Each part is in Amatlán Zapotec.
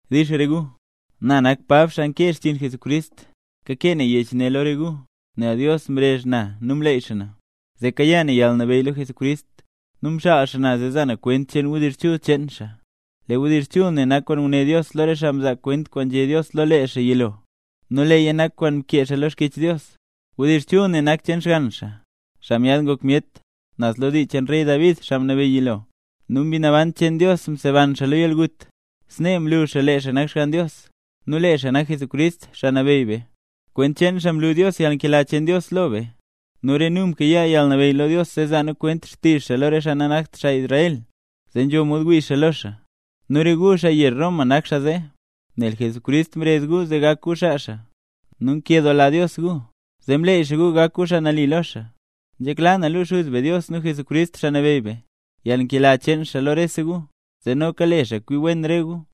Dix re gu. Na nak Pab, xaa nkee xchiin Jesucrist. Kakee na yech ne lo re gu, nel Dios mrezh na nu mleey xaa na, zee kayaa na yalnabeyy lo Jesucrist, nu mxaal xaa na zee za na kwent cheen wdizh chul cheen xaa. Lee wdizh chul ne nak kwaan nguné Dios lo re xaa mzaa kwent kwaan nzhé Dios lo lee xaa yilo, nu leeya nak kwaan mkee xaa lo Xkyech Dios. Wdizh chul ne nak cheen Xgann xaa, xaa myaad ngok myet, naz lo dii cheen rey David, xaa mnabeyy yilo, nu Mbi Naban cheen Dios mseban xaa lo yalgut, snee mlu xaa lee xaa nak Xgann Dios. Nu lee xaa nak Jesucrist, Xaa Nabeyy be. Kwent cheen lee xaa mlu Dios yalnkela cheen Dios lo be. Nu re nu mkayaa yalnabeyy lo Dios zee zaa nu kwent xtizh xaa lo re xaa nanakt xaa Israel, zee nzho mod wii xaa lo xaa. Nu re gu, xaa yezh Roma nak xaa zee, nel Jesucrist mrezh gu zee gak gu xaa xaa. Nu nkedoola Dios gu, zee mleey xaa gu gak gu nambey lo xaa. Nzhekla na luu Xuz be Dios, nu Jesucrist Xaa Nabeyy be, yalnkela cheen xaa lo rese gu; zee noka le xaa kwi wen re gu.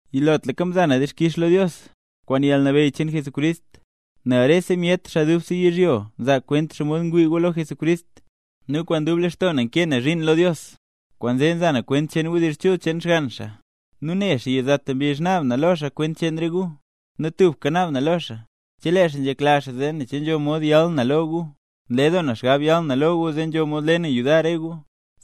Yilotlaka mza na dixkix lo Dios, kwaan yalnabeyy cheen Jesucrist, nel rese myet, xaa dubse yizhyo nzaa kwent xomod ngwii gu lo Jesucrist. Nu kwaan dub lextoo na nkee na zhiin lo Dios, kwaanzee nza na kwent cheen wdizh chul cheen Xgann xaa; nu ne xaa yizata mbizh naab na lo xaa kwent cheen re gu. Nu tubka naab na lo xaa, chelee xaa nzhekla zee ne che nzho mod yal na lo gu. Nle doo na xgab yal na lo gu zee nzho mod le na yudar re gu,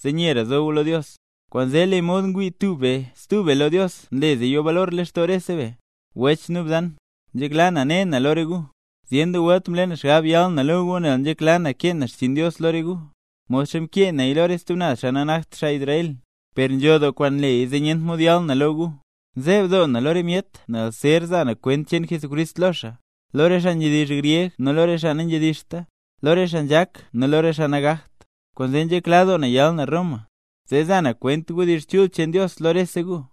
zee nyera zo gu lo Dios. Kwaanzee lee mod ngwii tub be stub be lo Dios, nle zee yo balor lextoo rese be. Wech nu bzan, nzhekla na ne na lo re gu; zyen doo welt mle na xgab yal na lo gu nel nzhekla na kee na xchiin Dios lo re gu, modxa mkee naya lo re stub naz xaa nanakt xaa Israel. Per nzho doo kwaan nleya zee nyent mod yal na lo gu. Nzeeb doo na lo re myet zer za na kwent cheen Jesucrist lo xaa, lo re xaa nzhedizh gryeg nu lo re xaa nanzhedizhta, lo re xaa nzhak nu lo re xaa nagakt. Kwaanzee nzhekla doo na yal na Roma, zee za na kwent wdizh chul cheen Dios lo rese gu.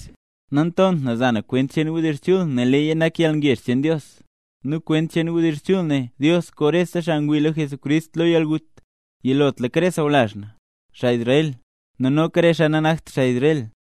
Nantont na za na kwent cheen wdizh chul nel leeya nak yalngezh cheen Dios, nu kwent cheen wdizh chul ne, Dios koo rese xaa ngwii lo Jesucrist lo yalgut, yilotlaka re sawlazh na, xaa Israel, nu noka re xaa nanakt xaa Israel.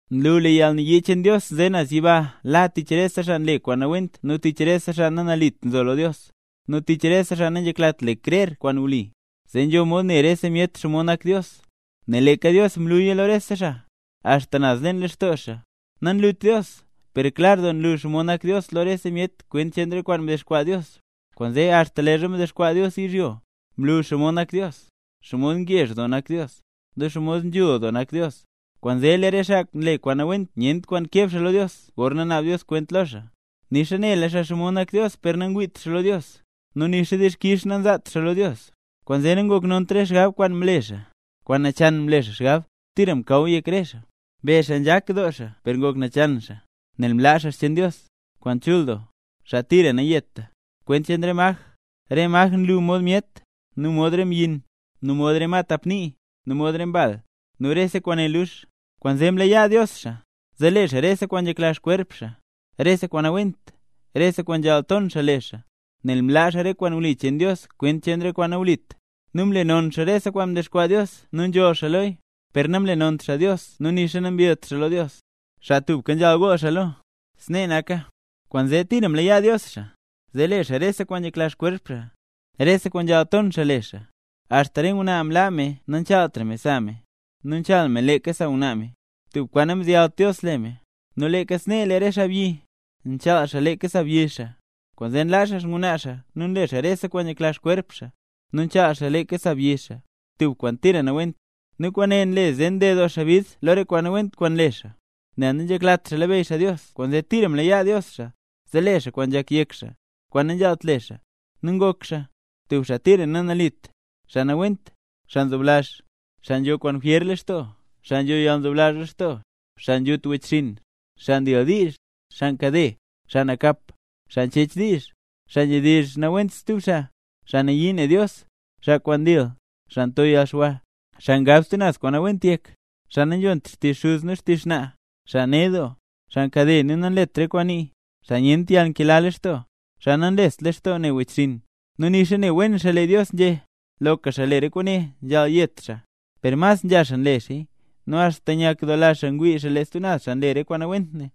Nlu lee yalnayii cheen Dios nze naz yiba la tich rese xaa nle kwaan nawent nu tich rese xaa nanalit nzo lo Dios, nu tich rese xaa nanzheklat le krer kwaan wli. Zee nzho mod ne rese myet xomod nak Dios, nel leeka Dios mluya lo rese xaa, axta naz leen lextoo xaa. Nanlut Dios, per klar doo nlu xomod nak Dios lo rese myet kwent cheen re kwaan mdexkwaa Dios. Kwaanzee axta leezha mdexkwaa Dios yizhyo, mlu xomod nak Dios, xomod ngezh doo nak Dios, nu xomod nzhul doo nak Dios. ¡Kwaanzee lee re xaa nle kwaan nawent nyent kwaan keb xaa lo Dios gorna naab Dios kwent lo xaa! Nixa nela xaa xomod nak Dios per nangwiit xaa lo Dios, nu nixa dixkix nanzaat xaa lo Dios; kwaanzee nangoknont re xgab kwaan mle xaa; kwaan nachan mle xaa xgab, tira mkaw yek re xaa. Mbezh xaa nzhak doo xaa per ngok nachan xaa, nel mlaa xaa xcheen Dios, kwaan chul doo, xaa tira nayeta, kwent cheen re maj, re maj kwaan nlu mod myet, nu mod re mbyin, nu mod re ma tap nii, nu mod re mball, nu rese kwaane lux. Kwaanzee mlayaa Dios xaa, zee le xaa rese kwaan nzhekla xkwerp xaa, rese kwaan nawent, rese kwaan nzhaal ton xaa le xaa. Nel mlaa xaa re kwaan wli cheen Dios kwent cheen re kwaan nawlit; nu nlenon xaa rese kwaan mdexkwaa Dios nu nzholl xaa loya, per namlenont xaa Dios nu nixa nambillt xaa lo Dios, xaa tubka nzhaal gool xaa lo. ¡Snee naka! Kwaanzee tira mlayaa Dios xaa, zee le xaa rese kwaan nzhekla xkwerp xaa, rese kwaan nzhaal ton xaa le xaa. Axta re ngwnaa mlaa me nachaaltra me sa me, nu nchaal me leeka sa ngwnaa me, tub kwaan namzeyalt Dios le me. Nu leeka snee lee re xaabyi, nchaal xaa leeka sa byi xaa. Kwaanzee nlaa xaa xngwnaa xaa nu nle xaa rese kwaan nzhekla xkwerp xaa, nu nchaal xaa leeka sa byi xaa, tub kwaan tira nawent. Nu kwaane nle zee nded doo xaa bid lo re kwaan nawent kwaan nle xaa. Nel nanzheklat xaa labeyy xaa Dios kwaanzee tira mlayaa Dios xaa, zee le xaa kwaan nzhak yek xaa, kwaan nanzhaalt le xaa. Nu ngok xaa: tub xaa tira nanalit, xaa nawent, xaa nzoblazh, xaa nzho kwaan jwyer lextoo, xaa nzho yalnzoblazh lextoo, xaa nzhut wechxinn, xaa ndildiizh, xaa nkade, xaa nakap, xaa nchech diizh, xaa nzhedizh nawent stub xaa, xaa nayii ne Dios, xaa nkwaan dil, xaa nto yalxwa, xaa ngab stub naz kwaan nawent yek, xaa nanzhont xtizh xuz nixa xtizh xnaa, xaa ned doo, xaa nkade nu nanlet re kwaan nii, xaa nyent yalnkela lextoo, xaa nanlest lextoo ne wechxinn. Nu nixa ne wen xaa lee Dios nzhé: “Loka xaa le re kwaane nzhaal yet xaa”. Per mas nzha xaa nle xaaya, nu axta nyakdoola xaa ngwii xaa lee stub xaa nle re kwaan nawent ne.